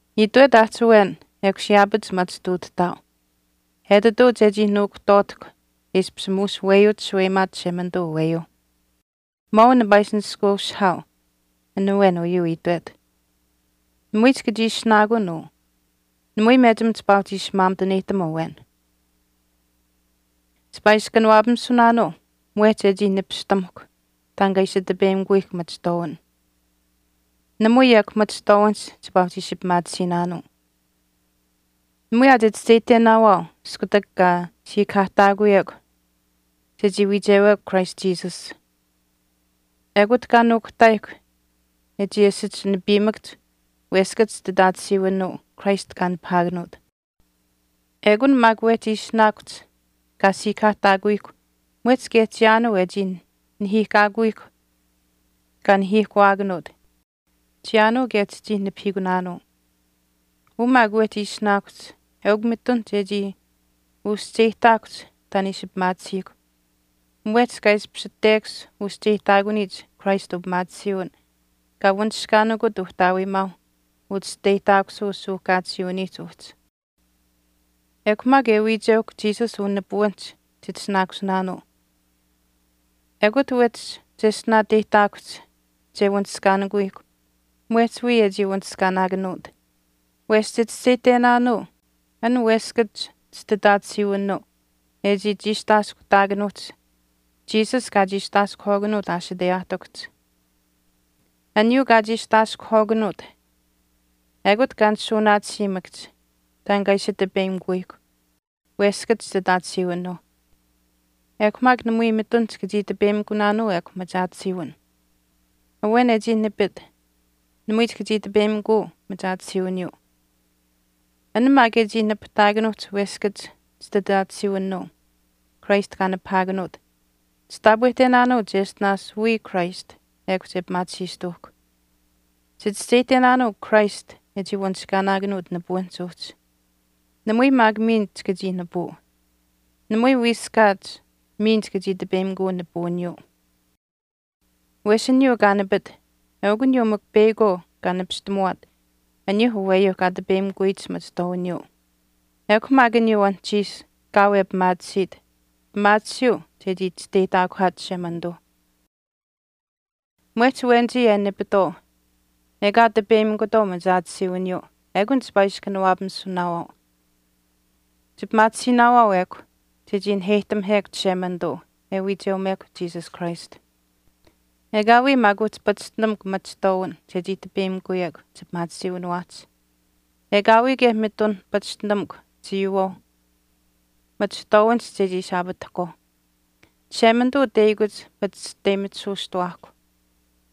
Itwet aahch awen ekush yaapach machituutahtaau etituu chechii nuukuhtwaatahkw e ishpish muush weyuuch shaweyimaat Chishemanituu aweyuuh. Mwaau nipaa ishi nishkweushihaau an awen uyuu itwet. Namui chika chii ishinaakun uu. Namui mechim chipaa uhchi ishi maamituneyihtam awen. Chipaa ishi kanawaapamisunaanuu mwehch e chii nipistamuhkw taan kaa ishi tipeyimikuyihkw machihtwaawin. Namui ekw machihtwaawinihch chipaa uhchi ishi pimaatisiinaanuu. Namui aa chichischeyihtenaawaau iskutak kaa siikahaahtaakuyihkw chechii wiichewekw Christ Jesus, ekut kaa nuukuhtaayihkw e chii asich nipiimakahch weskach chititaatisiwinuu Christ kaa nipahaakanuut. Ekun maak wehch ishinaakuhch kaa siikahaahtaakuyihkw mwehch kaye chiyaanuu e chii nahiihkaakuyihkw kaa nahiihkuwaakanuut kaye kaa nipahaakanuut chiyaanuu kaye chichii nipahiikunaanuu. Uu maak wehchii ishinaakuhch eukw mitun chechii uscheyihtaakuhch taan e ishi pimaatisiihkw mwehch kaa ishpish tekash uscheyihtaakuniyich Christ upimaatisiiwin kaa wanishkaanikut Uhtaawimaau uchisteyihtaakusuu suuhkaatisiiwiniihch uhchi. Ekw maak e wiicheuhkw Jesus unipuwinihch chitishinaakusinaanuu. Ekut wehchi cheshtinaateyihtaakuhch che wanishkaanikuyihk mwehch wiya e chii wanishkaanaakanuut. Wesh chichischeyihtenaanuu an weskach chititaatisiwinuu e chii chiistaaskuhtaakanuuhch Jesus kaa chiistaaskuhwaakanuut ashiteyaahtikuhch. Aniyuu kaa chiistaaskuhwaakanuut ekut kaa nishuunaatisiimakahch taan kaa ishi tipeyimikuyihkw weskach chititaatisiiwinuuh ekw maak namui mitun chika chii tipeyimikunaanuu ekw machaatisiiwin. Awen e chii nipit namui chika chii tipeyimikuu machaatisiiwiniyuu. An maak e chii nipahtaakanuuhch weskach chititaatisiiwinuu Christ kaa nipahaakanuut, chitaapwehtenaanuu cheshtinaash wiya Christ ekw che pimaatisiistuuhkw. Chichischeyihtenaanuu Christ e chii wanishkaanaakanuut nipuwinihch uhchi. Namui maak miin chika chii nipuu. Namui wiiskaat miin chika chii tipeyimikuu nipuwiniyuu. Wesh aniyuu kaa nipit eukw aniyuu mikw peyakwaau kaa nipistamuwaat aniyuuh aweyuuh kaa tipeyimikuyich machihtwaawiniyuu. Ekw maak aniyuu anuhchiish kaau e pimaatisiit, pimaatisiiu chechii chisteyihtaakuhaat Chishemanituu. Mwehch awenichii e nipitwaau ekaa tipeyimikutwaau machaatisiiwiniyuu ekun chipaa ishi kanawaapamisunaawaau. Chipimaatisiinaawaau ekw chechii naheyihtamihekw Chishemanituu e wiicheumekw Jesus Christ. Ekaawii maak uhchi pachishtinamukw machihtwaawin chechii tipeyimikuyekw chipimaatisiiwiniwaahch. Ekaawii kaye mitun pachishtinamukw chiiyuuwaauh machihtwaawinihch chechii ishi aapatahkwaau. Chishemanituu teyakuch pachishteyimitisuustawaahkw.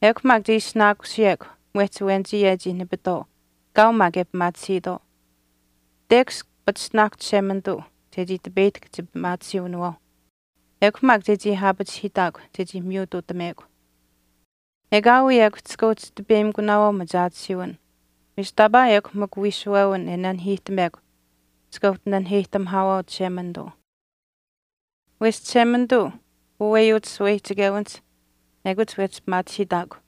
Ekw maak che ishinaakusiyekw mwehch awenichii e chii nipitwaau kaau maak e pimaatisiitwaau. Tekash pachishtinaahkw Chishemanituu chechii tipeyihtahk chipimaatisiiwinawaauh. Ekw maak chechii aapachihiitaakw chechii miyutuutamuwekw. Ekaawii ekw chika uhchi tipeyimikunaawaau machaatisiiwin wesh taapaa ekw mikw wiishuwewin e nanihiihtamekw chika uhchi naniheyihtamihaawaau Chishemanituu. Wesh Chishemanituu uweyuch shaweyihchichewinihch ekut wehchi pimaachihiitaakw.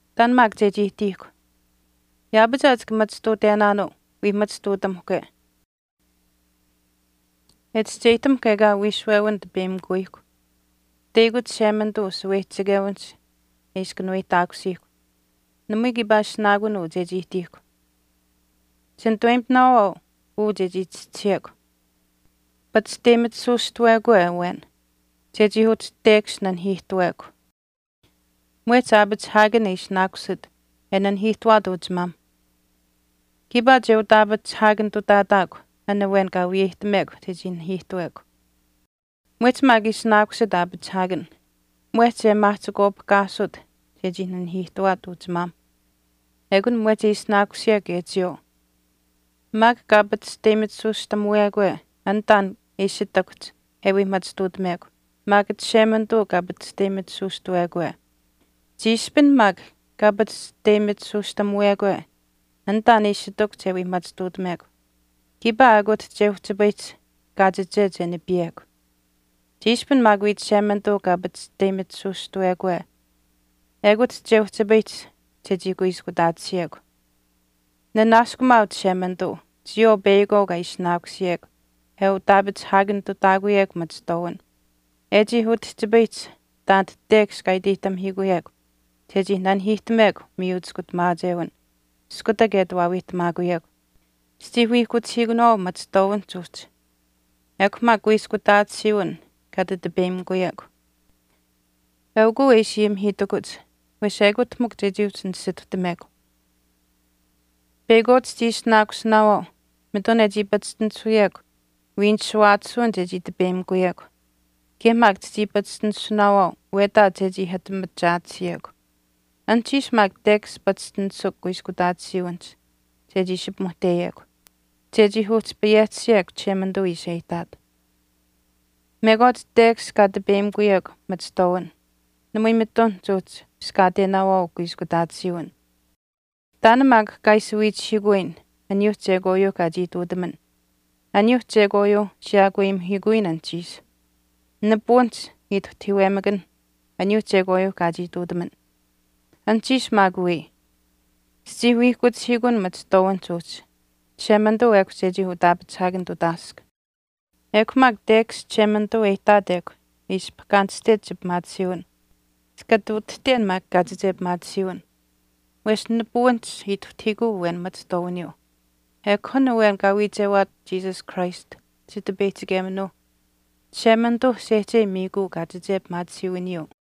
Taan maak chechii ihtiihkw. Yaapach aa chika machituutenaanuu wii machituutamuhkwe e chischeyihtamuhkw ekaa wiishuwewin tipeyimikuyihkw, teyakuch Chishemanituu ushaweyihchichewinihch e ishi kanuweyihtaakusiihkw. Namui kiipaa ishinaakun uu chechii ihtiihkw. Chinituweyimitinaawaau uu chechii chischisiyekw. Pachishteyimitisuustawekwe awen chechii uhchi tekash nanihiihtuwekw mwehch aapachihaakan e ishinaakusit e nanihiihtuwaat uchimaamh, kiipaa che utaapachihaakanitutaataakw an awen kaa wiyeyihtamekw chechii nanihiihtawekw. Mwehch maak e ishinaakusit aapachihaakan mwehch e maahchikwaapihkaasut chechii nanihiihtuwaat uchimaam ekun mwehch e ishinaakusiyekw kaye chiyawaau. Maak kaa pachishteyimitisuustamuwekwe an taan e ishi ihtakuhch e wii machituutamekw maak Chishemanituu kaa pachishteyimitisuustawekwe. Chiishpin maak kaa pachishteyimitisuustamuwekwe an taan e ishi ihtakuhch e wii machituutamekw kiipaa ekut che uhchipayihch kaachiche che nipiyekw. Chiishpin maak wiya Chishemanituu kaa pachishteyimitisuustawekwe ekut che uhchipayihch chechii kuiskutaatisiyekw. Ninanaaskumaau Chishemanituu chiyawaau peyakwaau kaa ishinaakusiyekw e utaapachihaakanitutaakuyekw machihtwaawin, e chii utihchipayihch taanit tekash kaa iteyihtamihiikuyekw chechii nanihiihtamekw miyu chiskutamaachewin iskutak e ati waawiihtamaakuyekw. Chichii wiihkuchihiikunaawaau machihtwaawinihch uhchi ekw maak kuiskutaatisiiwin kaa ati tipeyimikuyekw. Eukuu e ishi ayimihiitakuch wesh ekut mikw chechii uhchi nisituhtamekw. Peyakwaau chichii ishinaakusinaawaau mitun e chii pachishtinisuyekw wiinishuwaatisiiwin chechii tipeyimikuyekw kaye maak chichii pachishtinisunaawaau wetaach chechii ati machaatisiyekw. Anuhchiish maak tekash pachishtinisukw kuiskutaatisiiwinihch chechii ishi pimuhteyekw chechii uhchi payehtisiyekw Chishemanituu ishi e ihtaat. Mekwaach tekash kaa tipeyimikuyekw machihtwaawin namui mitun chuuhchi piskaatenaawaau kuiskutaatisiiwin. Taan maak kaa ishi wiichihiikuyin aniyuu chekwaayuuh kaa chii ihtuutaman, aniyuuh chekwaayuuh siyaakweyimuhiikuyin anuhchiish. Nipuwinihch ituhtahiiwemakanh aniyuuh chekwaayuuh kaa chii ihtuutaman. Anuhchiish maak wii, chichii wiihkuchihiikuun machihtwaawinihch uhchi Chishemanituu ekw chechii utaapachihaakanitutaask. Ekw maak tekash Chishemanituu e ihtaat ekw e ishi pahkaanishtech chipimaatisiiwin, chika ati utihten maak kaachiche pimaatisiiwin. Wesh nipuwinihch ituhtahiikuu awen machihtwaawiniyuu. Ekw an awen kaa wiichewaat Jesus Christ Chitipeyihchikeminuuh Chishemanituuh sehchei miikuu kaachiche pimaatisiiwiniyuu.